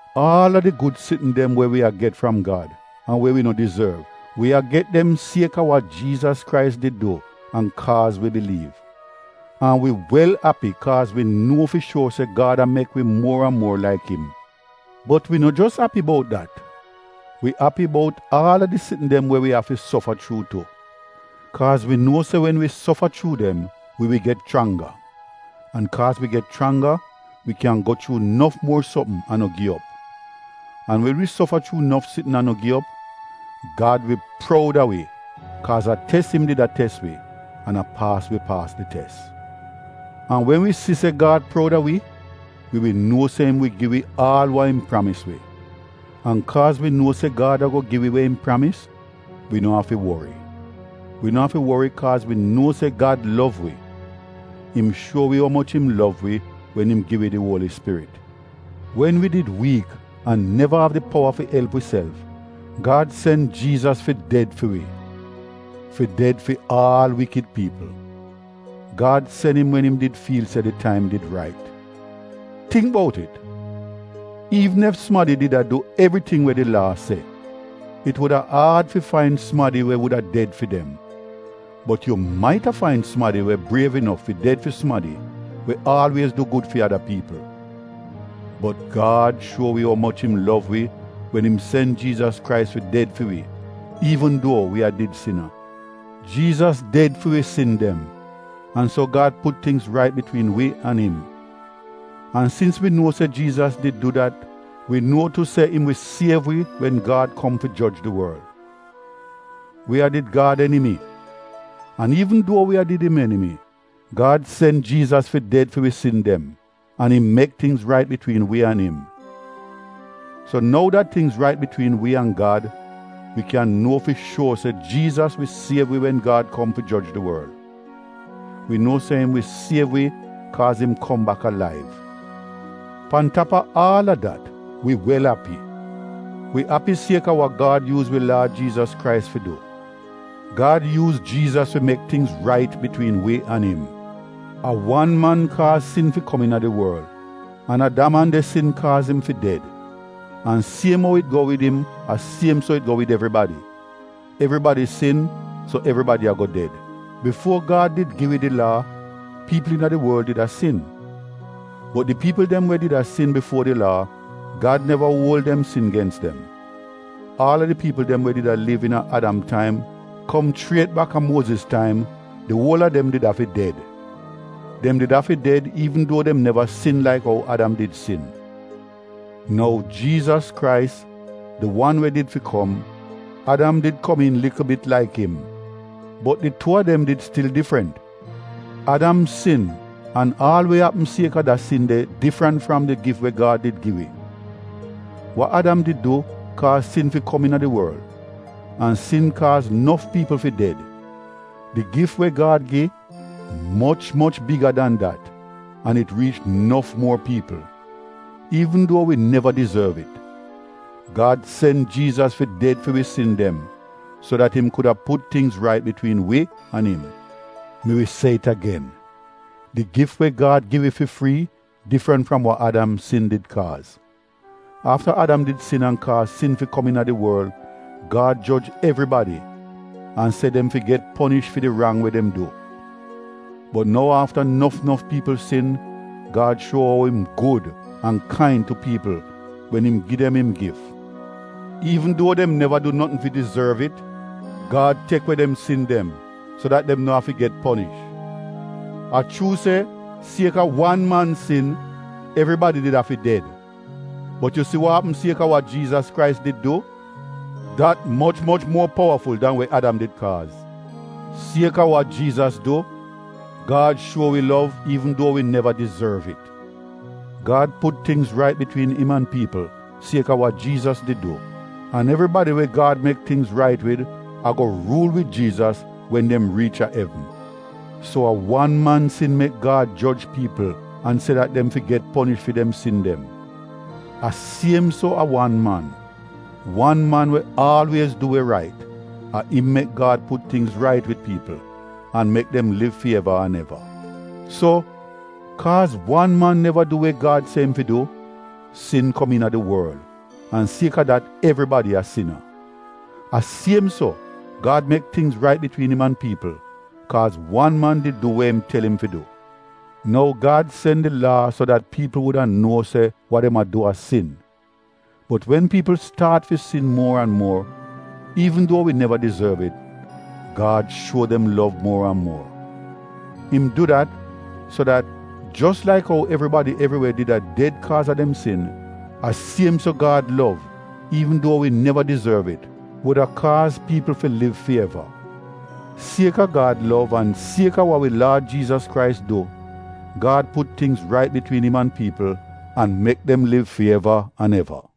Aal a di gud sitn dem we wi a get fram Gad an we wi no dizorv, wi a get dem sieka wa Jiizas Krais did du an kaaz wi biliiv. An wi wel api kaaz wi nuo fi shuor se Gad a mek wi muor an muor laik im. Bot wi no jos api bout dat, wi api bout aal a di sitn dem we wi afi sofa chuu tu. Kaaz wi nuo se wen wi sofa chuu dem, wi wi get chrangga, an kaaz wi get chrangga wi kyan go chuu nof muor sopm an no gi op. An wen wi sofa chuu nof sitn an no gi op, Gad wi proud a wi kaaz a tes im did a tes wi an a paas wi paas di tes. An wen wi si se Gad proud a wi, wi wi nuo se im wi gi wi aal wa im pramis wi. An kaaz wi nuo se Gad ago gi wi we im pramis, wi no afi wori. Wi no afi wori kaaz wi nuo se Gad lov wi. Im shuo wi umoch im lov wi wen im gi wi di Uoli Spirit. Wen wi did wiik an neva av di powa fi elp wiself, Gad sen Jiizas fi ded fi wi — fi ded fi aal wikid piipl. Gad sen im wen im did fiil se di taim did rait. (Tingk bout it! Iivn ef sumadi did a du evriting we di Laa se, it wuda aad fi fain sumadi we wuda ded fi dem, bot yu maita fain sumadi we briev inof fi ded fi sumadi we aalwiez du gud fi ada piipl.) Bot Gad shuo wi umoch im lov wi wen im sen Jiizas Krais fi ded fi wi, iivn duo wi a did sina. Jiizas ded fi wi sin dem, an so Gad put tingz rait bitwiin wi an im. An sins wi nuo se Jiizas did du dat wi nuo tu se im wi siev wi wen Gad kom fi joj di worl. Wi a did Gad enimi, an iivn duo wi a did im enimi, Gad sen Jiizas fi ded fi wi sin dem an im mek tingz rait bitwiin wi an im. So nou dat tingz rait bitwiin wi an Gad, wi kyan nuo fi shuor se Jiizas wi siev wi wen Gad kom fi joj di worl. Wi nuo se im wi siev wi kaaz im kom bak alaiv. Pan tap a aal a dat, wi wel api. Wi api sieka wa Gad yuuz wi Laad Jiizas Krais fi du. Gad yuuz Jiizas fi mek tingz rait bitwiin wi an im. A wan man kaaz sin fi kom iina di worl, an a da man de sin kaaz im fi ded. An siem ou it go wid im a siem so it go wid evribadi — evribadi sin so evribadi ago ded. Bifuo Gad did gi wi di Laa, piipl iina di worl did a sin. Bot di piipl dem we did a sin bifuo di Laa, Gad neva uol dem sin gens dem. Aal a di piipl dem we did a liv iina Adam taim kom chriet baka Muoziz taim, di uol a dem did afi ded. Dem did afi ded iivn duo dem neva sin laik ou Adam did sin. Nou Jiizas Krais, di wan we did fi kom, Adam did komiin likl bit laik im, bot di tuu a dem did stil difrant. Adam sin an aal we apm sieka da sin de difrant fram di gif we Gad did gi wi. Wa Adam did du kaaz sin fi kom iina di worl, an sin kaaz nof piipl fi ded. Di gif we Gad gi, moch moch biga dan dat an it riich nof muor piipl. Iivn duo wi neva dizorv it, Gad sen Jiizas fi ded fi wi sin dem so dat im kuda put tingz rait bitwiin wi an im. Mi wi se it agen, di gif we Gad gi wi fi frii difrant fram wa Adam sin did kaaz. Afta Adam did sin an kaaz sin fi kom iina di worl, Gad joj evribadi an se dem fi get ponish fi di rang we dem du. Bot nou afta nof nof piipl sin Gad shuo ou im gud an kain tu piipl wen im gi dem im gif. Iivn duo dem neva du notn fi dizorv it Gad tek we dem sin dem so dat dem no afi get ponish. A chuu se sieka wan man sin, evribadi did afi ded, bot yu si wa apm sieka wa Jiizas Krais did du, dat moch moch muor powaful dan we Adam did kaaz. Sieka wa Jiizas du, Gad shuo wi lov iivn duo wi neva dizorv it. Gad put tingz rait bitwiin im an piipl sieka wa Jiizas did du an evribadi we Gad mek tingz rait wid ago ruul wid Jiizas wen dem riich a evn. So a wan man sin mek Gad joj piipl an se dat dem fi get ponish fi dem sin dem. A siem so a wan man — wan man we aalwiez du we rait, a im mek Gad put tingz rait wid piipl an mek dem liv fi eva an eva. So, kaaz wan man neva du we Gad se im fi du, sin kom iina di worl an sieka dat evribadi a sina. A siem so, Gad mek tingz rait bitwiin im an piipl kaaz wan man did du we im tel im fi du. Nou Gad sen di Laa so dat piipl wuda nuo se wa dem a du a sin. Bot wen piipl staat fi sin muor an muor, iivn duo wi neva dizorv it, Gad shuo dem lov muor an muor. Im du dat, so dat, jos laik ou evribadi evriwe did a ded sieka dem sin, a siem so Gad lov iivn duo wi neva dizorv it, wuda kaaz piipl fi liv fi eva. Sieka Gad lov an sieka wa wi Laad Jiizas Krais du, Gad put tingz rait bitwiin im an piipl an mek dem liv fi eva an eva.